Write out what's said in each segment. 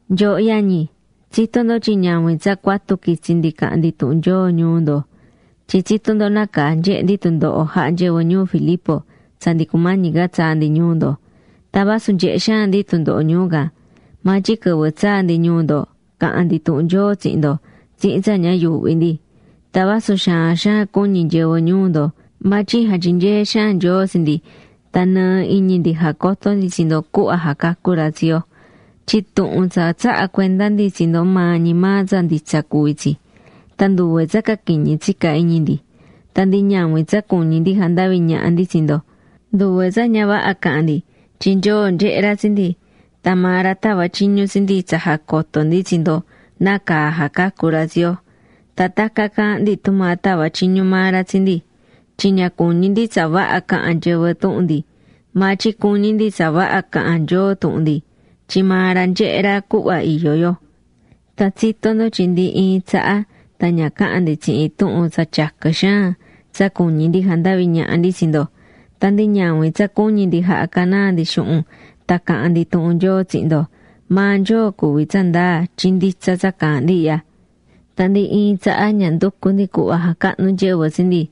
Nyooho yañi, tsitó ndo tyin ñavin tsa cuatu quitsi̱ ndi caha̱n ndi tuhun Nyoo ñuu ndo. Tyin tsitó ndo nácaa nyehe̱ ndi tundoho jaha̱ nyɨvɨ ñuu Filipo tsa ndi cumañi ca tsaa̱ ndi ñuu ndo. Tan vasu nyehe̱ xaan ndi tundoho ñuu can, maa tyin quɨvɨ tsaa̱ ndi ñuu ndo caha̱n ndi tuhun Nyoo tsihin ndo tsihin tsa ña yuuhví ndi. Tan vasu xaan xaan cuñi̱ nyɨvɨ ñuu ndo, maa tyin jatyinyee̱ xaan Nyoo tsi ndi tan nɨɨ iñi ndi jacoto̱ ndi tsi ndo cuhva jacacú ra tsi yo. Tyin tuhun tsa tsaha̱ cuenda ndi tsi ndo maa ñi maa tsa nditsa cuví tsi. Tan nduve tsa caquiñi tsica̱ iñi ndi. Tan ndi ñavin tsa cuñí ndi jandavi ñaha ndi tsi ndo. Nduve tsa ña vaha caha̱n ndi, tyin Nyoo nyehé ra tsi ndi, tan maa ra tava̱ tyiñu tsi ndi tsa jacoto ndi tsi ndo nácaa jacacú ra tsi yo. Tan tacan caahán ndi tumaa tava̱ tyiñu maa ra tsi ndi. Tyin ña cuñí ndi tsa vaha cahan nyɨvɨ tuhun ndi, maa tyin cuñí ndi tsa vaha cahan Nyoo tuhun ndi, tyin maa ra nyehé ra cuhva iyó yo. Tan tsitó ndo tyin ndi iin tsaha tan ña caha̱n ndi tsihin tuhun tsa tyaquɨ xaan tsa cuñí ndi jandavi ñaha ndi tsi ndo. Tan ndi ñavin tsa cuñi̱ ndi jaha canaa ndi xuhun tan caha̱n ndi tuhun Nyoo tsihin ndo. Maa Nyoo cuví tsandaa tyin nditsa tsa caahán ndi ihya. Tan ndi iin tsaha ña nducu̱ ndi cuhva jacahnu nyɨvɨ tsi ndi,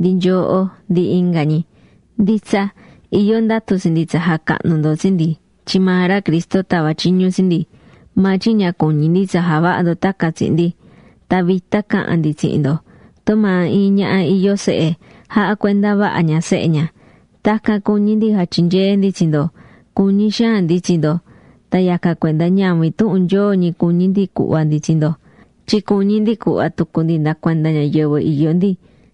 ndi nyooho, ndi inga ñi. Nditsa, iyó ndatu tsi ndi tsa jacahnu ndo tsi ndi tyin maa ra Cristo tava̱ tyiñu tsi ndi, maa tyin ña cuñí ndi tsa javaha ndo tacan tsihin ndi. Tan vita caha̱n ndi tsihin ndo. Tumaa iin ñaha iyó sehe jahá cuenda vaha ña sehe ña. Tacan cuñí ndi jatyinyee ndi tsi ndo. Cuñí xaan ndi tsi ndo, tan yacan cuenda ñavin tuhun Nyoo ñi cuñí ndi cuhva ndi tsi ndo, tyin cuñí ndi cuhva tucu ndi nda cuanda ñayɨvɨ iyó ndi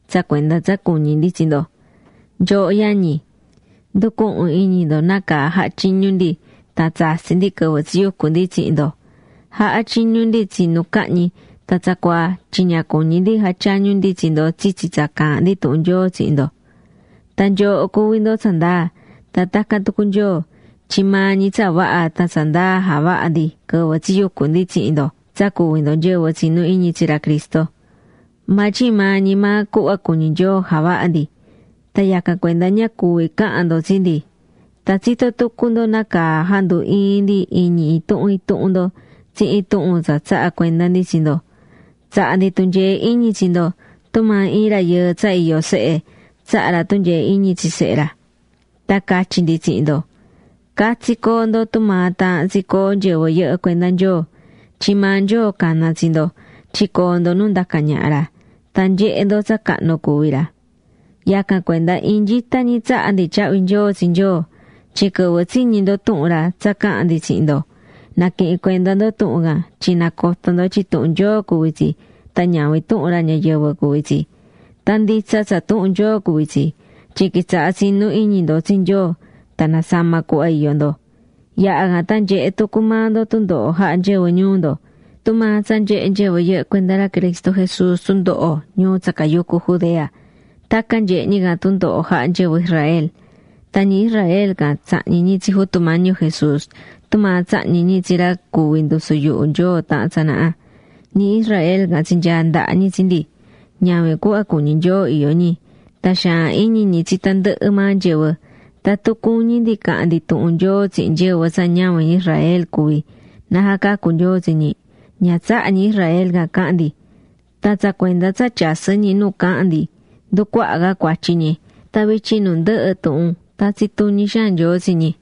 tsa cuenda tsa cuñí ndi tsi ndo. Nyooho yañi, nducuhún iñi ndo nácaa jaha̱ tyiñu ndi tan tsatsi̱ ndi quɨvɨ tsiyucu̱ ndi tsihin ndo. Jahá tyiñu ndi tsinu cahñi tan tsacuaa tyin ña cuñí ndi jatyañu ndi tsi ndo tsitsi tsa caahán ndi tuhun Nyoo tsihin ndo. Tan nyooho cuví ndo tsandaa, tan tacan tucu Nyoo, tyin maa ñi tsa vaha tan tsa ndaa javaha̱ ndi quɨvɨ tsiyucu̱ ndi tsihin ndo tsa cuví ndo nyɨvɨ tsinú iñi tsi ra Cristo. Maa tyin maa ñi maa cuhva cuñí Nyoo javaha̱ ndi, tan yacan cuenda ña cuví cahan ndo tsi ndi. Tan tsitó tucu ndo nácaa jandu ii̱n ndi iñi intuhun intuhun ndo tsihin tuhun tsa tsaha̱ cuenda ndi tsi ndo. Tsaha̱ ndi tunyee iñi tsi ndo tumaa iin rayɨɨ tsa iyó sehe tsahá ra tunyee iñi tsi sehe ra. Tan catyi̱ ndi tsihin ndo, catsi co̱o ndo tumaa taahán tsi coo nyɨvɨ yɨhɨ́ cuenda Nyoo. Tyin maa Nyoo cana̱ tsi ndo tyin coo ndo nu ndacá ñaha ra, tan nyehe ndo tsa cahnu cuví ra. Yacan cuenda iin nyita ñi tsahá ndi tyahvi nyoo tsi Nyoo, tyin quɨvɨ tsiñi̱ ndo tuhun ra tsa caha̱n ndi tsihin ndo, naquihi̱n cuenda ndo tuhun can tyin nacoto̱ ndo tyin tuhun Nyoo cuví tsi tan ñavin tuhun ra ñayɨvɨ cuví tsi. Tan nditsa tsa tuhun Nyoo cuví tsi, tyin quitsaha̱ tsinú iñi ndo tsi Nyoo tan nasama̱ cuhva iyó ndo. Yaha̱ can tan nyehe̱ tucu maa ndo tundoho jaha̱ nyɨvɨ ñuu ndo. Tumaa tsa nyehe̱ nyɨvɨ yɨhɨ́ cuenda ra Cristo Jesús ñuu tsa cayucú Judea. Tacan nyehe̱ ñi can tundoho jaha̱ nyɨvɨ Israel. Tan ñi Israel can tsahñi̱ ñi tsi Jutu Mañi yo Jesús tumaa tsahñi̱ ñi tsi ra cuvi̱ ndusu yuhu Nyoo taha̱n tsanaha. Ñi Israel can tsinyaa̱ ndaha ñi tsi ndi. Ñavin cuhva cuñí Nyoo iyó ñi. Tan xaan iñi ñi tsi tandɨhɨ maa nyɨvɨ. Tatun cuñí ndi cahan ndi tuhun Nyoo tsihin nyɨvɨ tsa ñavin ñi Israel cuví na jacacu Nyoo tsi ñi, ña tsahá ñi Israel can cahan ndi. Tan tsa cuenda tsa tyasɨ́ ñi nu caahán ndi, nducuaha ca cuatyi ñi. Tan vityin nu ndɨhɨ tuhun tatsí tuñi xaan Nyoo tsi ñi.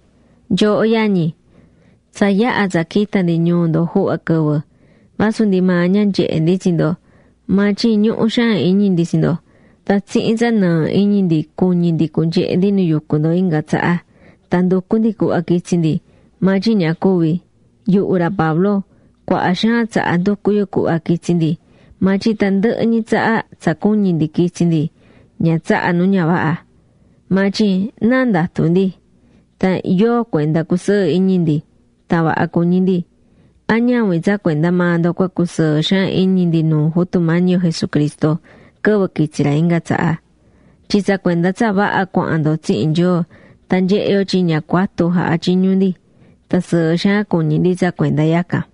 Nyooho yañi, tsa yaha̱ tsa quita̱ ndi ñuu ndo juhva quɨvɨ, vasu ndi maa ña nyehé ndi tsi ndo, maa tyin ñuhú xaan iñi ndi tsi ndo. Tan tsihin tsa nɨɨ iñi ndi cuñi̱ ndi cunyehe ndi nu yucú ndo inga tsaha. Tan nducu̱ ndi cuhva quitsi ndi, maa tyin ña cuvi̱. Yuhu ra Pablo, cuaha xaan tsaha nducu̱ yu cuhva quitsi ndi, maa tyin tandɨhɨ ñi tsaha tsa cuñi̱ ndi quitsi ndi, ña tsaha̱ nu ña vaha. Maa tyin ¿náa ndatú ndi? Tan ¿yóo cuenda cusɨɨ iñi ndi, tan vaha cuñí ndi? ¿A ñavin tsa cuenda maa ndo cua cusɨɨ xaan iñi ndi nuu Jutu Mañi yo Jesucristo quɨvɨ quitsi ra inga tsaha? Tyin tsa cuenda tsa vaha cuahán ndo tsihin Nyoo tan nyehé yo tyin ña cuatu jaha̱ tyiñu ndi. Tan sɨɨ xaan cuñí ndi tsa cuenda yacan.